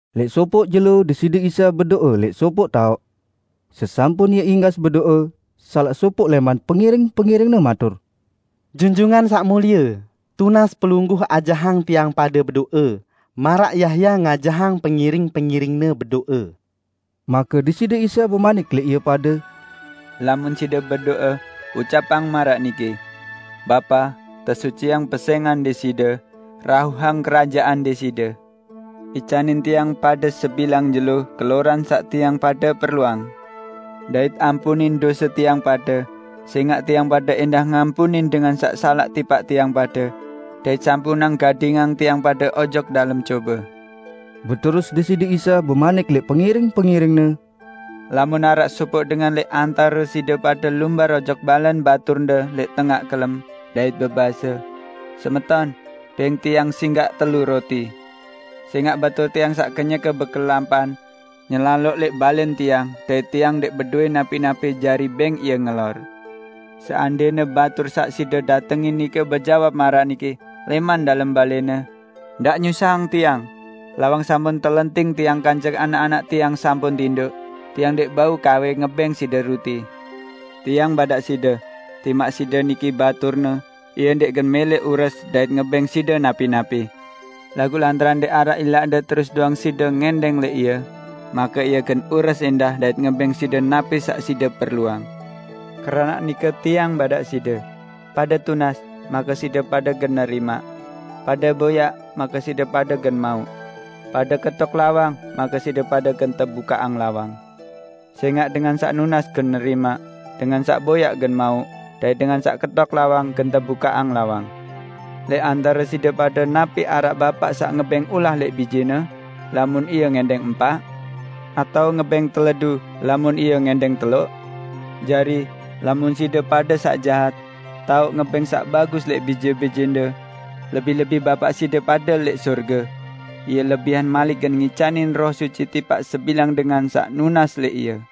Lẽq sopoq jelo Deside Isa bedo'e lẽq sopoq taoq. Sesampun Ie inggas bedo'e, salaq sopoq lẽman pengiring-pengiring-Ne matur, "Junjungan Saq Mulie, tunas Pelungguh ajahang tiang pade bedo'e maraq Yahya ngajahang pengiring-pengiringne bedo'e." Make Deside Isa bemanik lẽq ie pade, "Lamun side bedo'e, ucapang maraq niki, 'Bapa, tesuciang pesẽngan Deside. Rauhang Kerajaan Deside. Icanin tiang pade sebilang jelo keloran saq tiang pade perluang, dait ampunin dose tiang pade, sẽngaq tiang pade ẽndah ngampunin dengan saq salaq tipaq tiang pade; dait sampunang gadingang tiang pade ojok dalem cobe.' " Beterus Deside Isa bemanik lẽq pengiring-pengiring-Ne, "Lamun araq sopoq dengan lẽq antare side pade lumbar ojok balẽn baturne lẽq tengaq kelem, dait bebase, 'Semeton, bẽng tiang singgaq telu ruti, sẽngaq batur tiang saq kenyeke bekelampan, nyelaloq lẽq balẽn tiang dait tiang ndẽq bedowẽ napi-napi jari bẽng ie ngelor.' Seandẽne batur saq side datengin nike bejawab maraq niki, lẽman dalem balẽne, 'Ndaq nyusahang tiang! Lawang sampun telenting tiang kance anak-anak tiang sampun tindoq. Tiang ndẽq bau kawe ngebẽng side ruti.' " Tiang badaq side, timaq side niki baturne, ie ndẽq gen mẽlẽ ures dait ngebẽng side napi-napi. Laguq lantaran ndẽq araq ilaqde terus doang side ngẽndẽng lẽq ie, make ie gen ures ẽndah dait ngebẽng side napi saq side perluang. Keranaq nike Tiang badaq side: Pade tunas, make side pade gen nerimaq. Pade boyaq, make side pade gen mauq. Pade ketok lawang, make side pade gen tebukaqang lawang. Sẽngaq dengan saq nunas gen nerimaq; dengan saq boyaq gen mauq; dait dengan saq ketok lawang, gen tebukaqang lawang. Lẽq antare side pade napi araq bapaq saq ngebẽng ulah lẽq bijene, lamun ie ngẽndẽng empaq? Atao ngebẽng teledu, lamun ie ngẽndẽng teloq? Jari, lamun side pade saq jahat, tao ngebẽng saq bagus lẽq bije-bijende. Lebih-lebih Bapa side pade lẽq sorge! Ie lebihan malik gen ngicanin Roh Suci tipaq sebilang dengan saq nunas lẽq Ie!"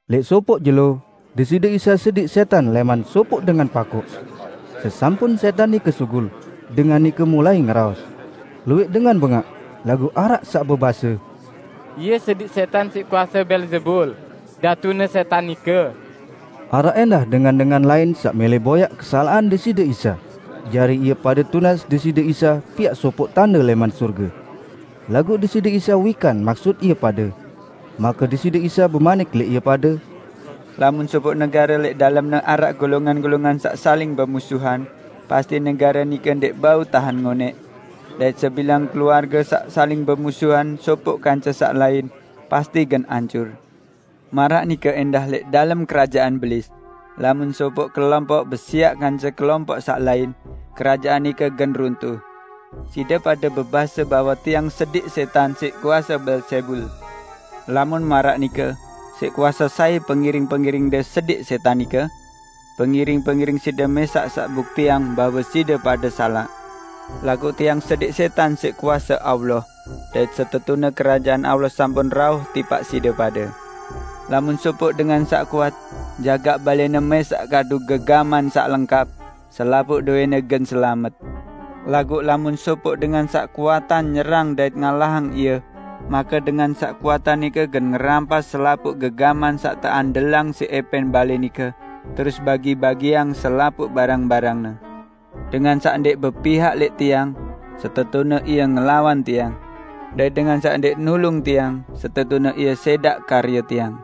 Lẽq sopoq jelo, Deside Isa sediq sẽtan lẽman sopoq dengan pakoq. Sesampun sẽtan nike sugul, dengan nike mulai ngeraos. Luwẽq dengan bengaq, laguq araq saq bebase, "Ie sediq sẽtan siq kuase Beelzebul, datune sẽtan nike." Araq ẽndah dengan-dengan lain saq mẽlẽ boyaq kesalaqan Deside Isa, jari ie pade tunas Deside Isa piaq sopoq tande lẽman sorge. Laguq Deside Isa wikan maksut ie pade. Make Deside Isa bemanik lẽq ie pade, "Lamun sopoq negare lẽq dalemne araq golongan-golongan saq saling bemusuhan, pasti negare nike ndẽq bau tahen ngonẽq. Dait sebilang keluarge saq saling bemusuhan sopoq kance saq lain, pasti gen ancur. Maraq nike ẽndah lẽq dalem kerajaan Belis; lamun sopoq kelompoq besiaq kance kelompoq saq lain, kerajaan nike gen runtuh. Side pade bebase bahwe Tiang sediq sẽtan siq kuase Beelzebul. Lamun maraq nike, siq kuase sai pengiring-pengiringde sediq sẽtan nike? Pengiring-pengiring side mẽsaq saq buktiang bahwe side pade salaq! Laguq Tiang sediq sẽtan siq kuase Allah, dait setetune Kerajaan Allah sampun rauh tipaq side pade. Lamun sopoq dengan saq kuat, jagaq balẽne mẽsaq kadu gegaman saq lengkap, selapuq dowẽne gen selamet. Laguq lamun sopoq dengan saq kuatan nyerang dait ngalahang ie, make dengan saq kuatan nike gen ngerampas selapuq gegaman saq teandelang siq ẽpẽn balẽ nike, terus bagi-bagiang selapuq barang-barangne. Dengan saq ndẽq bepihak lẽq Tiang, setetune ie ngelawan Tiang. Dait dengan saq ndẽq nulung Tiang setetune ie sẽdaq karye Tiang!"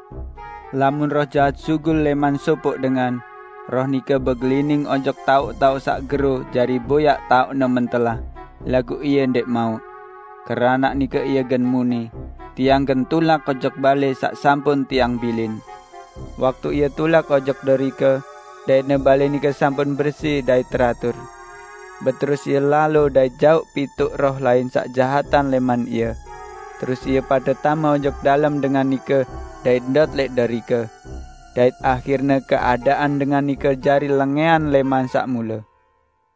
"Lamun roh jahat sugul lẽman sopoq dengan, roh nike begelining ojok taoq-taoq saq gero jari boyaq taoqne mentelah, laguq ie ndẽq mauq. Keranaq nike ie gen muni, 'Tiang gen tulak ojok balẽ saq sampun tiang bilin!' Waktu ie tulak ojok derike, daitne balẽ nike sampun bersi dait teratur. Beterus ie lalo dait jauq pituq roh lain saq jahatan lẽman ie. Terus ie pade tame ojok dalem dengan nike dait ndot lẽq derike. Dait ahirne keadaan dengan nike jari lengẽan lẽman saq mule."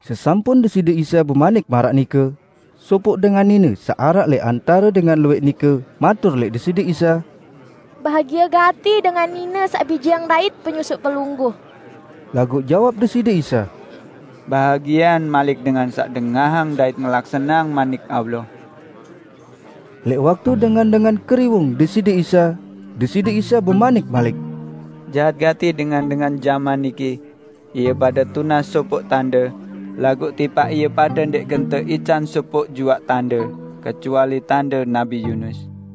Sesampun Deside Isa bemanik maraq nike, sopoq dengan nine saq araq lẽq antare dengan luwẽq nike matur lẽq Deside Isa, "Bahagie gati dengan nine saq bijeang dait penyusuq Pelungguh!" Laguq jawab Deside Isa, "Bahagiean malik dengan saq dengahang dait ngelaksaneang Manik Allah!" Lẽq waktu dengan-dengan keriwung Deside Isa, Deside Isa bemanik malik, "Jahat gati dengan-dengan jaman niki. Ie pade tunas sopoq tande, laguq tipaq ie pade ndẽq gen teican sopoq juaq tande, kecuali tande Nabi Yunus.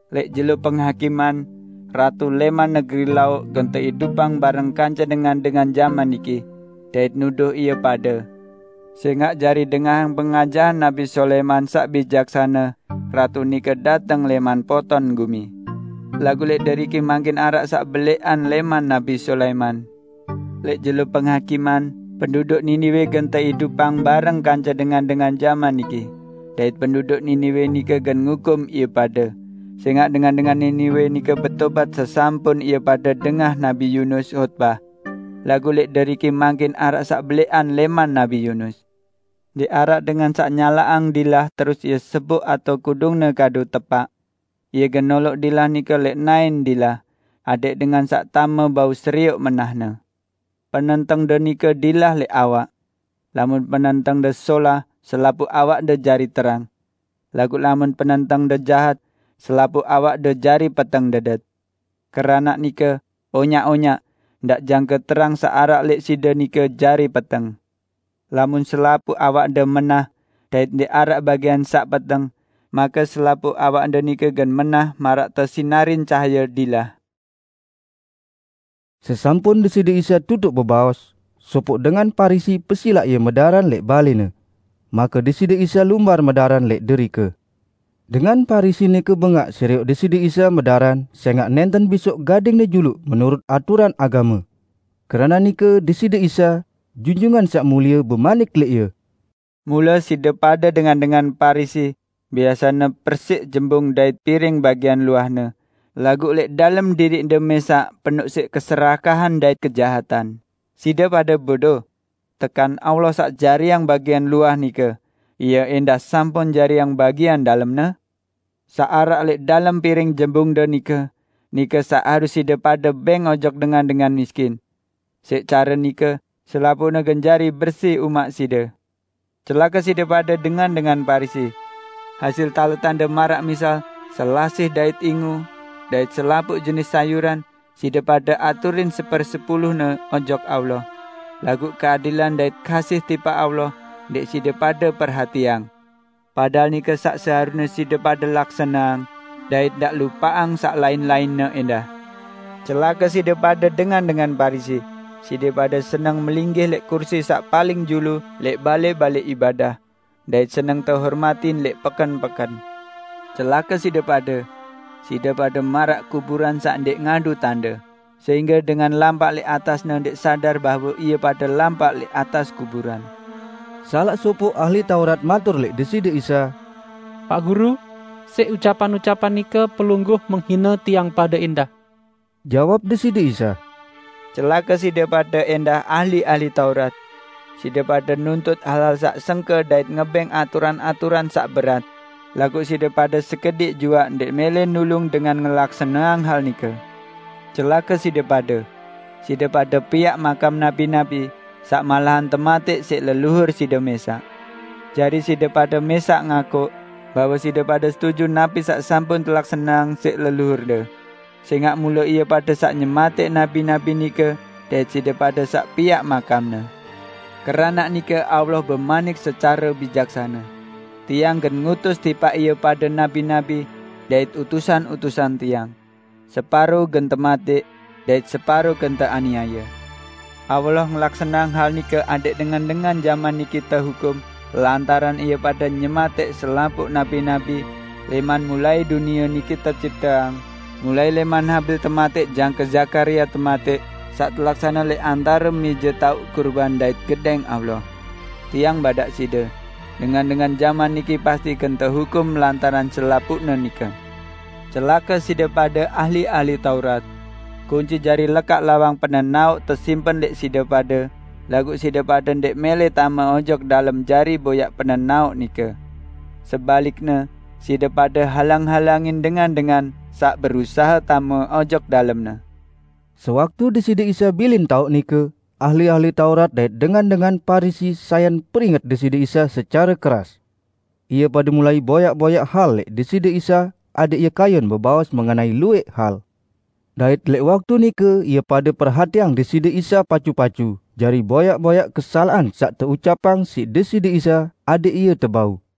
Lẽq jelo Penghakiman, ratu lẽman negeri Lauq gen teidupang bareng kance dengan-dengan jaman niki, dait nuduh ie pade. Sẽngaq, jari dengahang pengajahan Nabi Sulaiman saq bijaksane, ratu nike dateng lẽman poton gumi. Laguq lẽq deriki mangkin araq saq belẽqan lẽman Nabi Sulaiman! Lẽq jelo Penghakiman, penduduk Niniwe gen teidupang bareng kance dengan-dengan jaman niki, dait penduduk Niniwe nike gen ngukum ie pade, sẽngaq dengan-dengan Niniwe nike betobat sesampun ie pade dengah Nabi Yunus hotbah. Laguq lẽq deriki mangkin araq saq belẽqan lẽman Nabi Yunus!" "Ndẽq araq dengan saq nyalaqang dilah terus ie seboq atao kudungne kadu tepaq. Ie gen noloq dilah nike lẽq naẽn dilah, adẽq dengan saq tame bau serioq menahne. Penentengde nike dilah lẽq awak. Lamun penentengde solah, selapuq awakde jari terang. Laguq lamun penentengde jahat, selapuq awakde jari peteng dedet. Keranaq nike, onyaq-onyaq, ndaq jangke terang saq araq lẽq side nike jari peteng. Lamun selapuq awakde menah, dait ndẽq araq bagian saq peteng, make selapuq awakde nike gen menah maraq tesinarin cahaye dilah." Sesampun Deside Isa tutuq bebaos, sopoq dengan Parisi pesilaq Ie medaran lẽq balẽne. Make Deside Isa lumbar medaran lẽq derike. Dengan Parisi nike bengaq serioq Deside Isa medaran sẽngaq nẽnten bisoq gading-Ne juluq menurut aturan agame. Keranaq nike Deside Isa, Junjungan Saq Mulie bemanik lẽq ie, "Mule side pade dengan-dengan Parisi biasene persiq jembung dait piring bagian luahne, laguq lẽq dalem diriqde mẽsaq penoq secare pakse dait serakah. Side pade bodo! Tekan Allah saq jariang bagian luah nike, Ie ẽndah sampun jariang bagian dalemne? Saq araq lẽq dalem piring jembungde nike, nike saq harus side pade bẽng ojok dengan-dengan miskin. Siq care nike, selapuqne gen jari bersi umaq side. Celake side pade, dengan-dengan Parisi! Hasil taletande maraq misal selasih dait inggu dait selapuq jenis sayuran, side pade aturin sepersepulune ojok Allah, laguq keadilan dait kasih tipaq Allah ndẽq side pade perhatiang. Padahal nike saq seharusne side pade laksaneang dait ndaq lupaqang saq lain-lainne ẽndah. Celake side pade, dengan-dengan Parisi! Side pade seneng melinggih lẽq kursi saq paling julu lẽq balẽ-balẽ ibadah, dait seneng tehormatin lẽq peken-peken. Celake side pade! Side pade maraq kuburan saq ndẽq ngadu tande, sehingge dengan lampaq lẽq atasne ndẽq sadar bahwe ie pade lampaq lẽq atas kuburan." Salaq sopoq ahli Taurat matur lẽq Deside Isa, "Paq Guru, siq ucapan-ucapan nike, Pelungguh menghine tiang pade ẽndah!" Jawab Deside Isa, "Celake side pade ẽndah, ahli-ahli Taurat! Side pade nuntut hal-hal saq sengke dait ngebẽng aturan-aturan saq berat, laguq side pade sekediq juaq ndẽq mẽlẽ nulung dengan ngelaksaneang hal nike. Celake side pade! Side pade piaq makam nabi-nabi, saq malahan tematẽq siq leluhur side mẽsaq. Jari side pade mẽsaq ngakuq, bahwe side pade setuju napi saq sampun telaksaneang siq leluhurde; sẽngaq mule ie pade saq nyematẽq nabi-nabi nike dait side pade saq piaq makamne. Keranaq nike Allah bemanik secare bijaksane, 'Tiang gen ngutus tipaq ie pade nabi-nabi dait utusan-utusan Tiang; separo gen tematẽq, dait separo gen teaniaye!' Allah ngelaksaneang hal nike adẽq dengan-dengan jaman niki tehukum lantaran ie pade nyematẽq selapuq nabi-nabi lẽman mulai dunie niki tecipteang, mulai lẽman Habil tematẽq jangke Zakaria tematẽq, saq telaksane lẽq antare mẽje taoq kurban dait Gedẽng Allah. Tiang badaq side: Dengan-dengan jaman niki pasti gen tehukum lantaran selapuqne nike. Celake side pade, ahli-ahli Taurat! Kunci jari lekaq lawang penenaoq tesimpen lẽq side pade, laguq side pade ndẽq mẽlẽ tame ojok dalem jari boyaq penenaoq nike. Sebalikne side pade halang-halangin dengan-dengan saq berusahe tame ojok dalemne!" Sewaktu Deside Isa bilin taoq nike, ahli-ahli Taurat dait dengan-dengan Parisi sayan peringet Deside Isa secare keras. Ie pade mulai boyaq-boyaq hal lẽq Deside Isa adẽq Ie kayun bebaos mengenai luwẽq hal. Dait lẽq waktu nike ie pade perhatiang Deside Isa pacu-pacu jari boyaq-boyaq kesalaqan saq teucapang siq Deside Isa, adẽq Ie tebau.